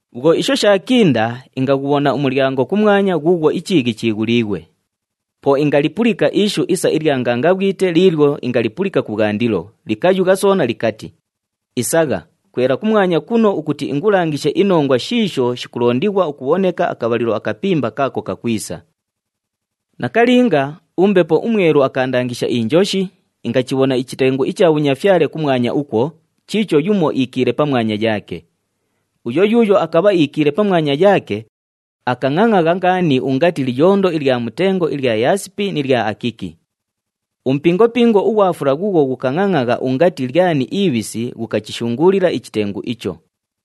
Bhwo isho shaakinda, ingaghubhona umulyango kumwanya ghuughwo ichiighi chighuliighwe! Po ingalipulika ishu isa ilya ngangabhwite liilyo ingalipulika kubhwandilo, likayugha soona likati, “Isagha, kwela kumwanya kuno ukuti ingulangishe inongwa shiisho shikulondighwa ukubhoneka akabhalilo akapimba kaako kakwisa.” Nakalinga, uMbepo uMwelu akaandangisha injoshi, ingachibhona ichitengu icha bhunyafyale kumwanya ukwo, chiicho yumo iikiile pamwanya yaake. Uyo yuuyo akabha iikiile pamwanya yaake, akangʼangʼagha ngaani ungati liyondo ilya mutengo ilya yaasipi ni lya akiki. Umupingopingo ughwa fula ghuughwo ghukangʼangʼagha ungati lyani ibhisi ghukachishunguulila ichitengu icho.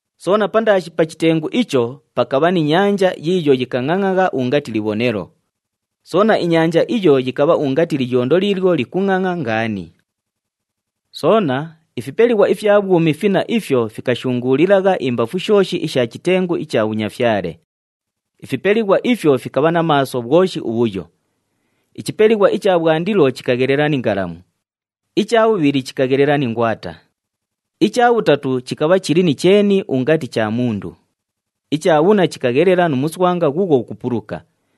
Soona pandaashi pa chitengu icho, pakabha ni nyanja yiiyo yikangʼangʼagha ungati libhonelo. Soona, inyanja iyo yikabha ungati liyondo liilyo likungʼangʼa ngaani. Soona, ifipelighwa ifya bhwumi finna ifyo fikashunguulilagha imbafu shooshi isha chitengu icha bhunyafyale. Ifipelighwa ifyo fikabha na maaso bhwoshi ubhuyo. Ichipelighwa icha bhwandilo chikaghelela ni ngalamu. Icha bhubhili chikaghelela ni ngwata. Icha bhutatu chikabha chili ni cheeni ungati cha mundu. Icha bhunna chikaghelela nu muswanga ghuughwo ghukupuluka.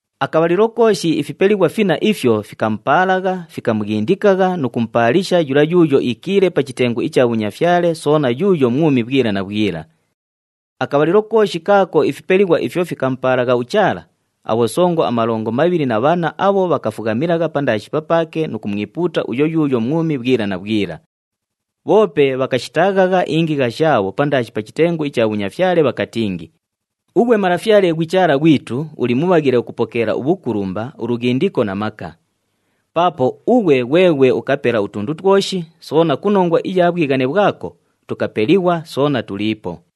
Akabhalilo kooshi ifipelighwa finna ifyo, fikamupaalagha, fikamughindikagha nu kumupaalisha yula yuuyo iikiile pa chitengu icha bhunyafyale soona yuuyo mwumi bhwila na bhwila. Akabhalilo kooshi kaako ifipelighwa ifyo fikamupaalagha uChaala, abhosongo amalongo mabhili na bhanna abho bhakafughamilagha pandaashi papaake nu kumwipuuta uyo yuuyo mwumi bhwila na bhwila. Bhoope bhakashitaaghagha ingigha shaabho pandaashi pa chitengu icha bhunyafyale bhakatingi, “Ughwe Malafyale ghwi Chaala ghwitu, uli mubhaghile ukupokeela ubhukulumba, ulughindiko na maka. Paapo ughwe ghweghwe ukapela utundu twoshi, soona ku nongwa iya bhwighane bhwako, tukapelighwa soona tuliipo.”